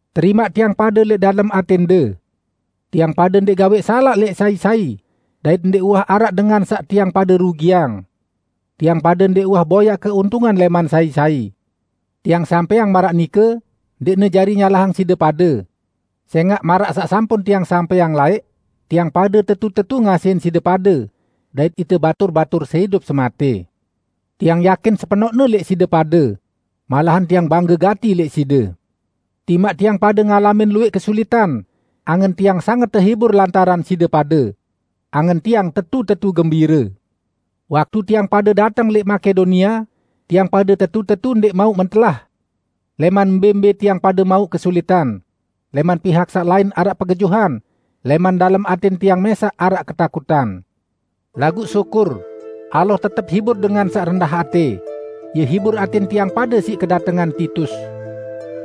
Terimaq tiang pade lẽq dalem atẽnde. Tiang pade ndẽq gawẽq salaq lẽq sai-sai, dait ndẽq uwah araq dengan saq tiang pade rugiang. Tiang pade ndẽq uwah boyaq keuntungan lẽman sai-sai. Tiang sampẽang maraq nike, ndẽqne jari nyalahang side pade. Sẽngaq, maraq saq sampun tiang sampẽang laẽq, tiang pade tetu-tetu ngasihin side pade, dait ite batur-batur seidup-sematẽ. Tiang yakin sepenoqne lẽq side pade. Malahan tiang bangge gati lẽq side! Timaq tiang pade ngalamin luwẽq kesulitan, angen tiang sanget tehibur lantaran side pade. Angen tiang tetu-tetu gembire! Waktu tiang pade dateng lẽq Makedonia, tiang pade tetu-tetu ndẽq mauq mentelah. Lẽman mbẽ-mbẽ tiang pade mauq kesulitan: Lẽman pihak saq lain araq pegejuhan, lẽman dalem atẽn tiang mẽsaq araq ketakutan. Laguq syukur, Allah tetep hibur dengan saq rendah atẽ; Ie hibur atẽn tiang pade siq kedatengan Titus.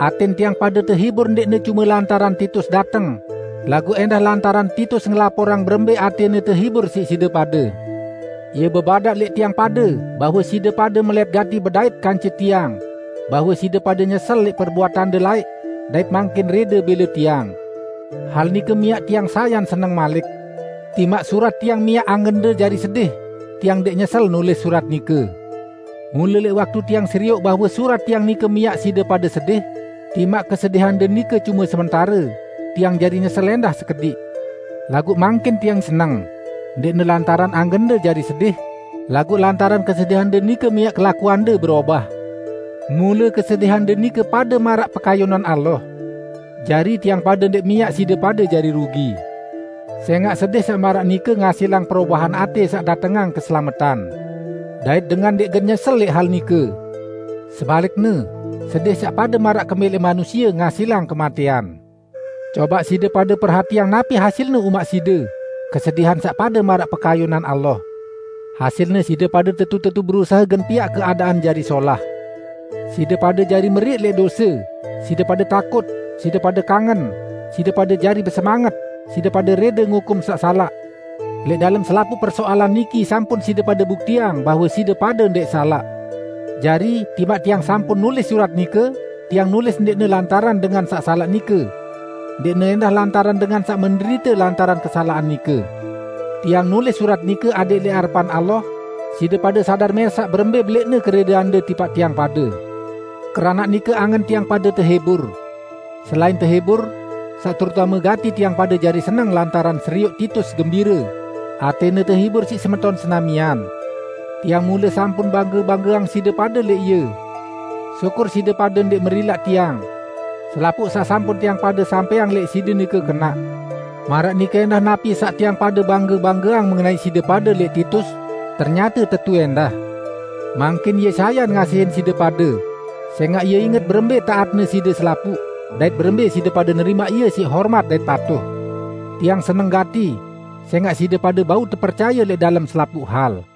Atẽn tiang pade tehibur ndẽqne cume lantaran Titus dateng, laguq ẽndah lantaran Titus ngelaporang berembẽ atẽne tehibur siq side pade. Ie bebadaq lẽq tiang pade bahwe side pade melẽt gati bedait kance tiang; bahwe side pade nyesel lẽq perbuatande laẽq dait mangkin rẽde bẽle tiang. Hal nike miaq tiang sayan seneng malik. Timaq surat tiang miaq angende jari sedih, tiang ndẽq nyesel nulis surat nike. Mule lẽq waktu tiang serioq bahwe surat tiang nike miaq side pade sedih -- timaq kesedihande nike cume sementare -- tiang jari nyesel ẽndah sekediq. Laguq mangkin tiang seneng -- ndẽqne lantaran angende jari sedih, laguq lantaran kesedihande nike miaq kelakuande berobah. Mule kesedihande nike pade maraq pekayunan Allah. Jari, tiang pade ndẽq miaq side pade jari rugi. Sẽngaq sedih saq maraq nike ngasilang perobahan atẽ saq datengang keselametan. Dait dengan ndẽq gen nyesel lẽq hal nike. Sebalikne, sedih saq pade maraq kemẽlẽq manusie ngasilang kematẽan. Cobaq side pade perhatiang napi hasilne umaq side, kesedihan saq pade maraq pekayunan Allah! Hasilne, side pade tetu-tetu berusahe gen piaq keadaan jari solah! Side pade jari meriq lẽq dose, side pade takut, side pade kangen, side pade jari besemanget, side pade rẽde ngukum saq salaq! Lẽq dalem selapuq persoalan niki sampun side pade buktiang bahwe side pade ndẽq salaq. Jari, timaq tiang sampun nulis surat nike, tiang nulis ndẽqne lantaran dengan saq salaq nike. Ndẽqne ẽndah lantaran dengan saq menderite lantaran kesalaqan nike. Tiang nulis surat nike adẽq lẽq arepan Allah, side pade sadar mẽsaq berembẽ belẽqne kerẽdeande tipaq tiang pade. Keranaq nike angen tiang pade tehibur. Selain tehibur, saq terutame gati tiang pade jari seneng lantaran serioq Titus gembire; atẽne tehibur siq semeton senamian. Tiang mule sampun bangge-banggeang side pade lẽq ie. Syukur, side pade ndẽq merilaq tiang. Selapuq saq sampun tiang pade sampẽang lẽq side nike kenaq. Maraq nike ẽndah napi saq tiang pade bangge-banggeang mengenai side pade lẽq Titus, ternyate tetu ẽndah. Mangkin ie sayan ngasihin side pade, sẽngaq ie inget berembẽ taatne side selapuq, dait berembẽ side pade nerimaq ie siq hormat dait patuh. Tiang seneng gati, sẽngaq side pade bau tepercaye lẽq dalem selapuq hal.